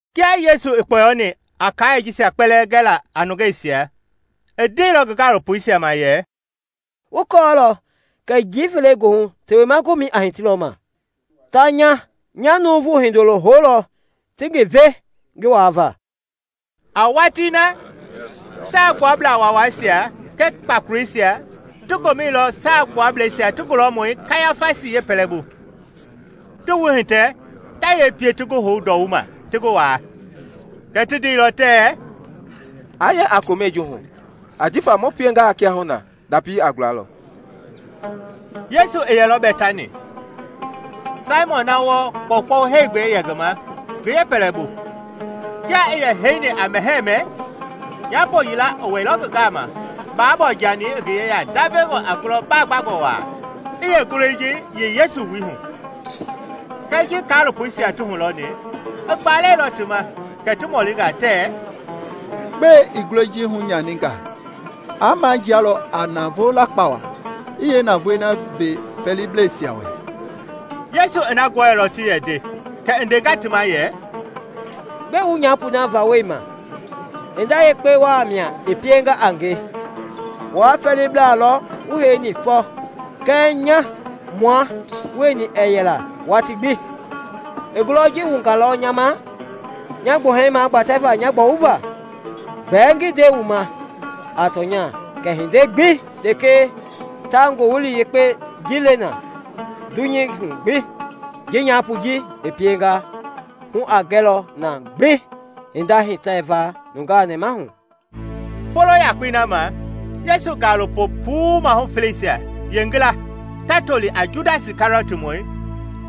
Kia Yesu i kpɔyoni a kaai jisia kpɛlɛɛ gela a nungeisia, i ndeilɔ ngi gaalopoisia ma yɛ, “Wu kɔɔlɔ kɛ njii fele goohu Tewema Gomɛi a hitilɔ ma. Ta nya nya Nuuvu Hindoloi houlɔ ti ngi ve ngi waava.” A watii na Saagbuablaa Waawaisia kɛɛ kpakoleisia ti gomɛilɔ Saagbuablɛisia ti gulɔmɔi Kayafasi yeepɛlɛbu, ti wuhitɛ ta yee pie ti ngi hou ndɔwuma ti ngi waa. Kɛɛ ti ndeilɔ tɛɛ, “Aa yɛ a komɛi ji hu, ajifa mu piengaa kiahuna ndapi a gulalɔ.” Yesu i yɛlɔ Bɛtani, Saimɔn na wɔɔ kpɔukpɔu heegbɛi i yɛ ngi ma, ŋgi yeepɛlɛbu. Kia i yɛ heini a mɛhɛɛ mɛ, nyaapo yila i wɛilɔ ngi gama baabɔɔ-jani i ngi yeya ndavengɔ a ngulɔ baagbangɔ waa, i yeengulɔi ji yei Yesu wui hu. Kɛɛ ji kaalopoisia ti hulɔni, i gbalɛilɔ ti ma kɛ ti mɔlinga tɛɛ, “Gbɛe i ngulɔi ji hunyaninga? Aa majialɔ a navoo lakpa waa, i yeenavoei ve fɛɛliblɛisia wɛ.” Yesu i na gɔɛilɔ ti yɛ nde kɛ i ndenga ti ma yɛ, “Gbɛe wu nyaapoi vawɔlima? Hinda yekpe waa mia i pienga a nge. Wua fɛɛlibla lɔ wu heini fɔ, kɛɛ nya mua wueni ɛɛ yɛla watii gbi. I ngulɔi ji wungalɔ nya ma nya gbuhɛi magbatɛvaa nya gbɔwuva. Gbɛɛ ngi nde wu ma a tɔnya kɛ hinda gbi lekee ta Ngowili Yekpei ji le na dunyei hu gbi, ji nyaapoi ji i pienga hu a gɛlɔ na ngi hinda hitɛva nungaa nɛmahu.” Folo yakpei na, Yesu gaalopo puu maahu feleisia yeengila ta toli a Judasi Kɛriɔtmɔi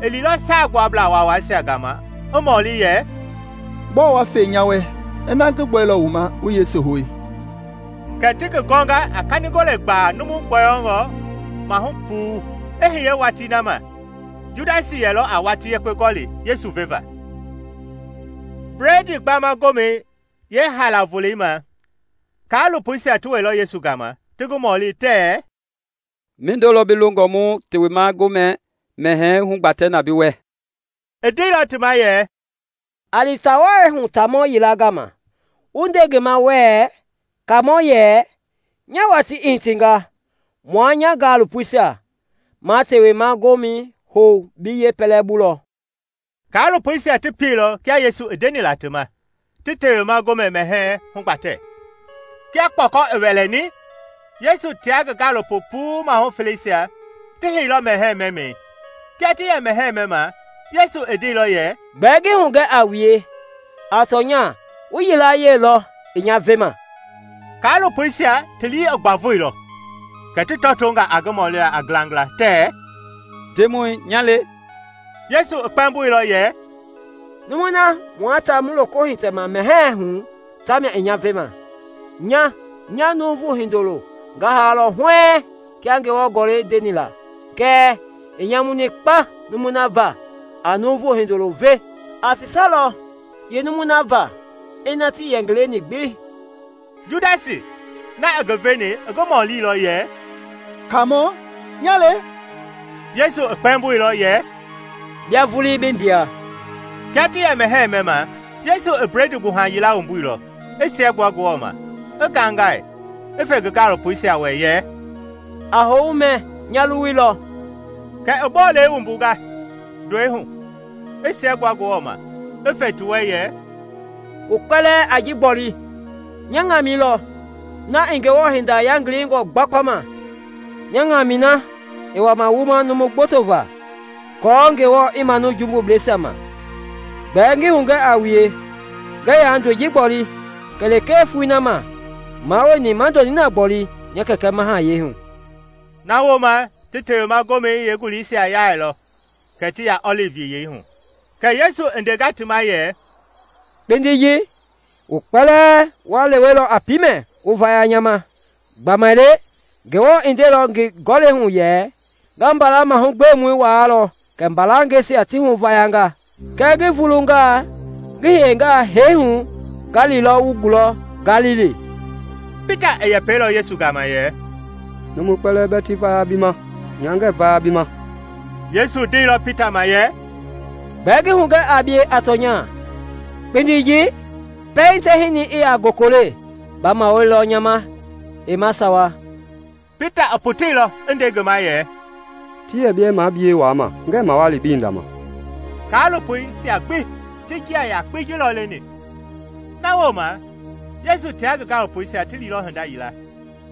i liilɔ Saagbuablaa Waawaisia gama i mɔli yɛ, “Gbɔɔ wa fe nya wɛ ina ngi gbɔilɔ wu ma wu Yesu hou?” Kɛ ti ngi gɔnga a kanigole gbaa numu gbɔyɔngɔ maahu puu. I hiye watii na ma Judasi yɛlɔ a watii yekpe gɔli Yesu veva. Bledii Gbama Gomɛi yeehaalaa volei ma, kaalopɔisia ti wɛilɔ Yesu gama ti ngi mɔli tɛɛ, “Mindo lɔ bi longɔ mu Tewema Gomɛ mɛhɛɛ hugbatɛ na bi wɛ?” I ndeilɔ ti ma yɛ, “A li taa wai hu taamɔ yila gama wu nde ngi ma wɛɛ, ‘Kaamɔ yɛ, Nya watii i hitinga; mua nya gaalopoisia ma Tewema Gomɛi hou bi yeepɛlɛbu lɔ.’” Kaalopoisia ti pieilɔ kia Yesu i ndeni la ti ma, ti Tewema Gomɛ mɛhɛɛ hugbatɛ. Kia kpɔkɔ i wɛlɛni, Yesu tia ngi gaalopo puu maahu feleisia ti heilɔ mɛhɛɛ mɛmɛi. Kia ti yɛ mɛhɛɛ mɛma Yesu i ndeilɔ yɛ, “Gbɛɛ ngi hugɛ a wue a tɔnya, wu yilayee lɔ i nya vema.” Kaalopoisia ti lii i gbavoilɔ, kɛ ti tɔtonga a ngi mɔlila a ngilangila tɛɛ, “Ndemɔi, nya le?” Yesu i kpɛmboilɔ yɛ, “Numui na mua ta mu loko hitɛma mɛhɛɛi hu tamia i nya vema. Nya nya Nuuvu Hindoloi nga haalɔ huɛɛŋ kia Ngewɔ Gɔlɛi ndeni la, kɛɛ i nyamuni kpa numui na va a Nuuvu Hindoloi ve! Aa fisalɔ yeenumui na va ina tii yɛ ngi leni gbi.” Judasi na i ngi veni i ngi mɔlilɔ yɛ, “Kaamɔ, nya le?” Yesu i kpɛmboilɔ yɛ, “Bia vulii bi ndea.” Kia ti yɛ mɛhɛɛ mɛma, Yesu i bledii gbuha yila wumbuilɔ, i siɛgbua Ngewɔ ma, i ngaingai, i fe ngi gaalopoisia wɛ yɛ, “A hou wu mɛ, nya luwui lɔ.” Kɛ i bolei wumbunga, ndɔi i hu, i siɛgbua Ngewɔ ma, i fe ti wɛ yɛ, “Wu kpɛlɛɛ a ji gboli; nya ŋamɛi lɔ, na i Ngewɔ hinda yangilingɔi gbakpama, nya ŋamɛi na i wama wuma numu gboto va aako Ngewɔ i manu jumbuisia ma. Gbɛɛ ngi hugɛ a wue, ngɛɛ yaa ndɔi ji gboli kɛlee foloi na mua wueni ma ndɔ ninɛi gbɔle nya Kɛkɛ mahayɛi hu.” Na wooma ti Tewema Gomɛi Yeenguleisia yailɔ kɛ ti ya ɔlivi Yiyei hu. Kɛ Yesu i ndenga ti ma yɛ, “Kpindi ji, wu kpɛlɛɛ wa lewelɔ a piimɛ wu vaya nya ma; gbamaile Ngewɔ i ndeilɔ ngi Gɔlɛi hu yɛ, ‘Nga mbala mahugbemɔi waalɔ kɛ mbalangɛisia ti hu i vayanga.’ Kɛɛ ngi vulungaa ngi hiye hee hu, nga lilɔ wu gulɔ Galili.” Pita i yɛpɛilɔ Yesu gama yɛ, “Numui kpɛlɛɛ bɛɛ ti vaya bi ma, nya ngɛɛ vaya bi ma.” Yesu ndeilɔ Pita ma yɛ, “Gbɛɛ ngi hugɛ a bie a tɔnya, kpindi ji, pɛiŋ tɛhinɛi i yaa gokole, ba mawalilɔ nya hinda ma heima sawa.” Pita i poteilɔ i nde ngi ma yɛ, “Ti yɛ bɛɛ mua bie waama, ngɛɛ mawali bi hinda ma.” Kaalopoisia gbi ti njia yakpei ji lɔ leni. Na wooma Yesu tia ngi gaalopoisia ti liilɔ hinda yila,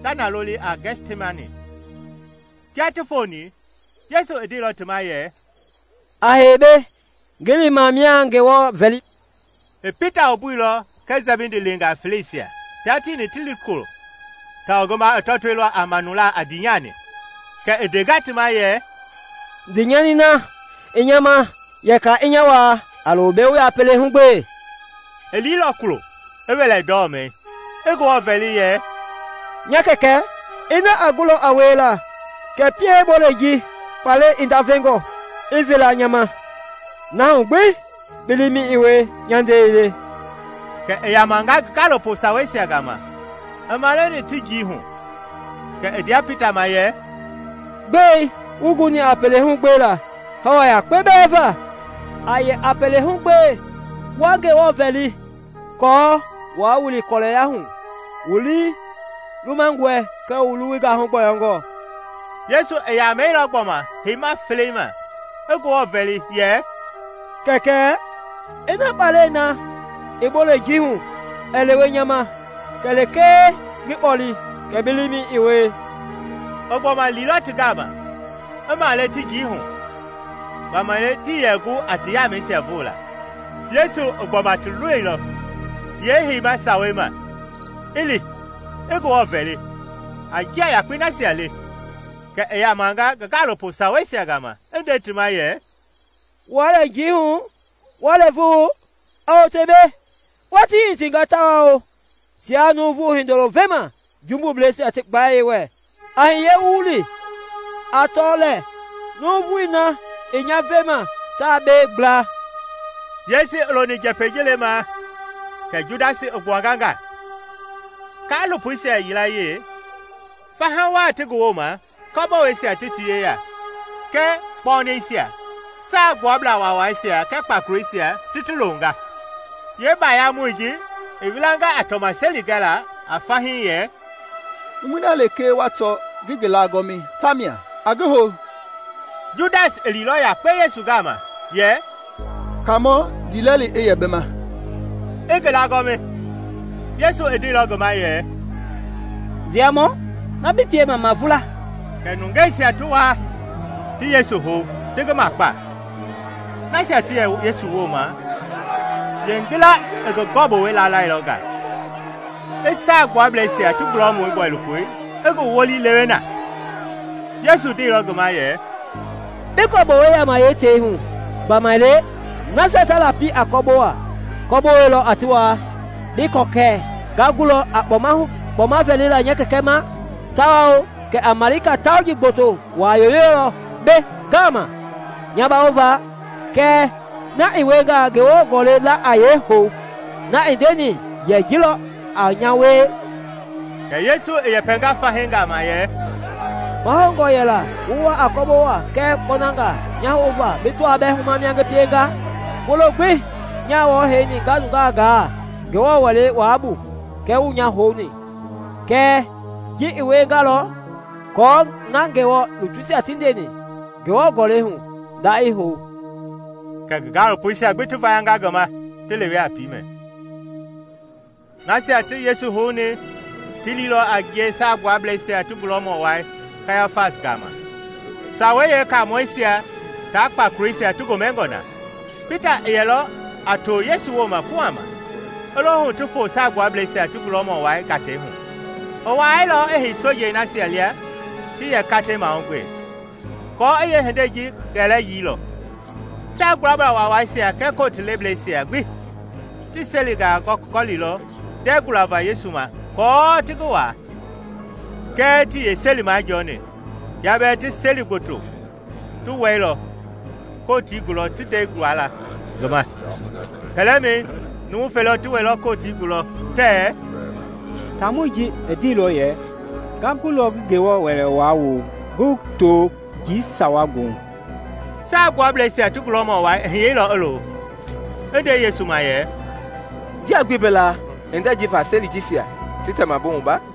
ta na loli a Gɛtsimani, kia ti foni, Yesu i ndeilɔ ti ma yɛ, “A hei mbei, ngi li mia ngi Ngewɔ vɛli.” I Pita wumbuilɔ kɛɛ Sɛbidi leengaa feleisia tia tieni ti li kulo tawao ngi maa i tɔtoilɔ a manulaa a ndiinyani. Kɛ i ndenga ti ma yɛ, “Ndiinyani na i nya ma yɛkɛ i nya waa; a lo mbei wu yɛ a pelehu gbee.” I liilɔ kulo, i wɛlɛ ndɔmɛi, i Ngewɔ vɛli yɛ, “Nya Kɛkɛ, ina a gulɔ a wiela kɛ pie bolei ji kpalɛi i ndavengɔ i veela nya ma; na hu gbi bi liimɛi i wie, nya ndɛi ii le.” Kɛ i yamanga ngi gaalopo saweisia gama i male ti njii hu; kɛ i ndea Pita ma yɛ, “Gbɛe, wuii guni a pelehu gbela hawa yakpe bɛɛ va? A yɛ a pelehu gbe, wa Ngewɔ vɛli aako waa wili kɔlɛya hu; wu lii lumangɔe kɛɛ wu luwui gahu gbɔyɔngɔ.” Yesu i yamɛilɔ gbɔma yeeheima felei ma, i Ngewɔ vɛli yɛ, “Kɛkɛ, ina kpalɛi na i bolei ji hu ɛɛ lewe nya ma kɛlee ngi kpɔle, kɛ bi liimɛi i wie.” I gbɔma liilɔ ti gama i male ti njii hu, gbamaile tii yɛ gu a ti yamɛisia voola. Yesu i gbɔma ti loilɔ yeeheima sawei ma, i li, i Ngewɔ vɛli, a njia yakpei nasia le. Kɛ i yamanga ngi gaalopo saweisia gama i nde ti ma yɛ, “Wuaa lɛ njii hu, wa lɛɛvu? A wote mbei, watii i hitinga tawao tiaa Nuuvu Hindoloi vema jumbubleisia ti gbayei wɛ. A hiye mu li. A tɔ lɛɛ, numui na i nya vema taa mbei gbla.” Yesu i loni njɛpɛi ji lemaa kɛ Judasi i gbuanga nga, kaalopoisia yilayee, faha waa ti ngi wooma kɔboweisia ti ti yeya kɛɛ kpɔnɛisia, Saagbuablaa Waawaisia kɛɛ kpakoleisia ti ti longa. Yeebayamɔi ji i wilanga a tɔmaseli gɛla a fahii yɛ, “Numui na lekee wa tɔ ngi ngi laagɔmi, tamia; a ngi hou.” Judasi i liilɔ yakpe Yesu gama yɛ, “Kaamɔ, ndiilɛli i yɛ bi ma”, i ngi laagɔmi. Yesu i ndeilɔ ngi ma yɛ, “Ndiamɔ, na bi piema, mavula.” Kɛ nungeisia ti waa, ti Yesu hou, ti ngi makpa. Nasia ti yɛ Yesu wooma yeengila i ngi gɔbowɛi laalɛilɔ nga i Saagbuablɛisia ti gulɔmɔi bɔilopoi i ngi wolii lewe na. Yesu ndeilɔ ngi ma yɛ, “Bi gɔbowei yaama yeetei hu; gbamaile nasia ta lapi a kɔbowei, kɔbowei lɔ a ti waa. Bii kɔɔ kɛ nga gulɔ a kpɔma vɛlila nya Kɛkɛ ma tawao kɛ a malika tauji gboto waa yoyolɔ mbɛ ngaama nya bawova? Kɛɛ na i wiengaa, Ngewɔ Gɔlɛi la a yeehou, na i ndeni yɛ ji lɔ a nya wie?” Kɛ Yesu i yɛpɛnga fahii gama yɛ, “Mahoungɔ yɛla wu wa a kɔbowangaa kɛɛ kpɔnangaa nya houva bi tɔaa bɛɛ humamɔ mia a nge? Folo gbi nyaa wɔɔ heini nga nungaa gaa Ngewɔ Wɛlei Wai bu, kɛɛ wuii nya houni. Kɛɛ ji i wiengalɔ aako na Ngewɔ lutuisia ti nyɛini Ngewɔ Gɔlɛi hu nda i hou.” Kɛ ngi gaalopoisia gbi ti vayanga ngi ma, ti lewe a piimɛ. Nasia ti Yesu houni ti liilɔ a ngie Saagbuablɛisia ti gulɔmɔ wai Kayafasi gama, Sawei Yeekaamɔisia tia kpakoleisia ti gomɛngɔ na. Pita i yɛlɔ a to Yesu ma kuhama, i lo hu ti foo Saagbuablɛisia ti gulɔmɔ wai gatei hu. I wuailɔ i hei sojei nasia lia ti yɛ katei mahugbe, aako i yeehindei ji gɛlɛyii lɔ. Saagbuablaa Waawaisia kɛɛ Kotii lebleisia gbi ti selingaa gɔlilɔ ndɛɛ gualava Yesu ma aako ti ngi waa. Kɛɛ tii yeeseli majɔɔni kia bɛɛ seli gboto ti wɛilɔ Kotii gulɔ ti ndɛi guala ngi ma. Kɛlɛmɛi numu fele ti wɛilɔ Kotii gulɔ tɛɛ, “Taamɔi ji i ndeilɔ yɛ, ‘Nga gulɔ ngi Ngewɔ Wɛlei Wai wolo, ngi to njii sawa goohu.’” Saagbuablɛisia ti gulɔmɔ wai i hiyeilɔ i lo, i nde Yesu ma yɛ, “Njia gbii bi laa hindei ji va seli jisia ti tɛma bi wumba?”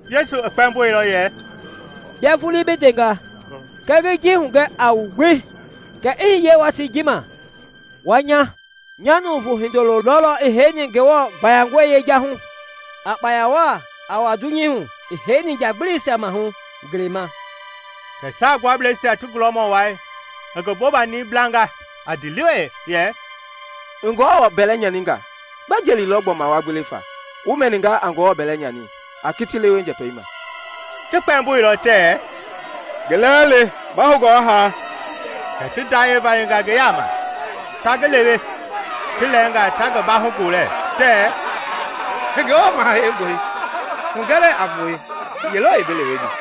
Yesu i kpɛmboilɔ yɛ, “Bia vulii bi ndenga. Kɛɛ ngi hugɛ a wu gbi kɛ i hiye watii ji ma wa nya nya Nuuvu Hindoloi lɔlɔ i heini Ngewɔ gbayangɔi yejahui, a gbɔma wa dunyei hu i heini njagbilisia maahu ngelei ma.” Kɛ Saagbuablɛisia ti gulɔmɔ wai i ngi bobani blanga a ndiilewe yɛ, “I Ngewɔ bɛlɛ nyaninga. Gbɛ jeli lɔ gbɔma ma gbewe fa? Wu mɛninga na a Ngewɔ bɛlɛ nyani. A kiti lewe njɛpɛi ma!” Ti kpɛmboilɔ tɛɛ, “Ngi lɛɛ le, mahoungɔ i haa.” Kɛ ti ndayɛi valinga ngi yaama, ta ngi lewe, ti lɛɛnga ta ngi bahu gbolɛ, tɛɛ, “Ngewɔ Maha Heingɔi! Hugɛ lɛɛ a mue ye lɔ i bi leweni.”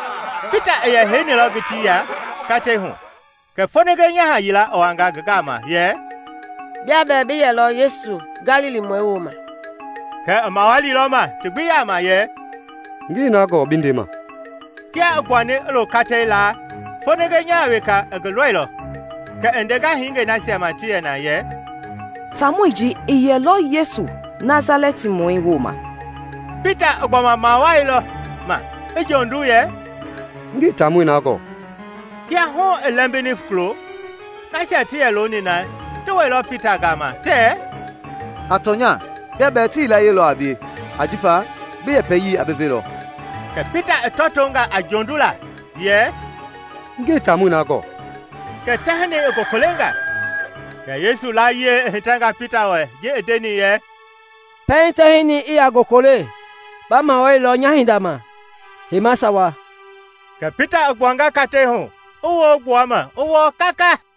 Pita i yɛ heinilɔ ngitii ya katei hu kɛ foninge nyaha yila i wanga ngi gama yɛ, “Bia bɛɛ bi yɛlɔ Yesu Galilimɔi wooma.” Kɛɛ i mawalilɔ ma ti gbi yaama yɛ, “Ngii na gɔɔ bi ndema.” Kia i gbuani i lo katei laa, foninge nyaha weka i ngi lɔilɔ, kɛ i ndenga hingei nasia ma ti yɛ na yɛ, “Taamɔi ji i yɛlɔ Yesu Nasalɛtimɔi wooma.” Pita i gbɔma mawalilɔ ma, i jondu yɛ, “Ngii taamɔi na gɔɔ.” Kia hu i lɛmbini kulo, nasia ti yɛ looni na ti wɛilɔ Pita gama tɛɛ, “A tɔnya, bia bɛɛ ti yilayee lɔ a bie, ajifa bi yɛpɛyii a bi velɔ.” Kɛ Pita i tɔtonga a jondulaa yɛ, “Ngii taamɔi na gɔɔ.” Ngaamɛi na kɛ tɛhinɛi i gokolenga. Kɛ Yesu layie i hitɛnga Pita wɛ ji i ndeni yɛ, “Pɛiŋ tɛhinɛi i yaa gokole ba mawalilɔ nya hinda ma heima sawa.” Kɛ Pita i gbuanga katei hu, i woo gbua ma i wɔɔ kaka.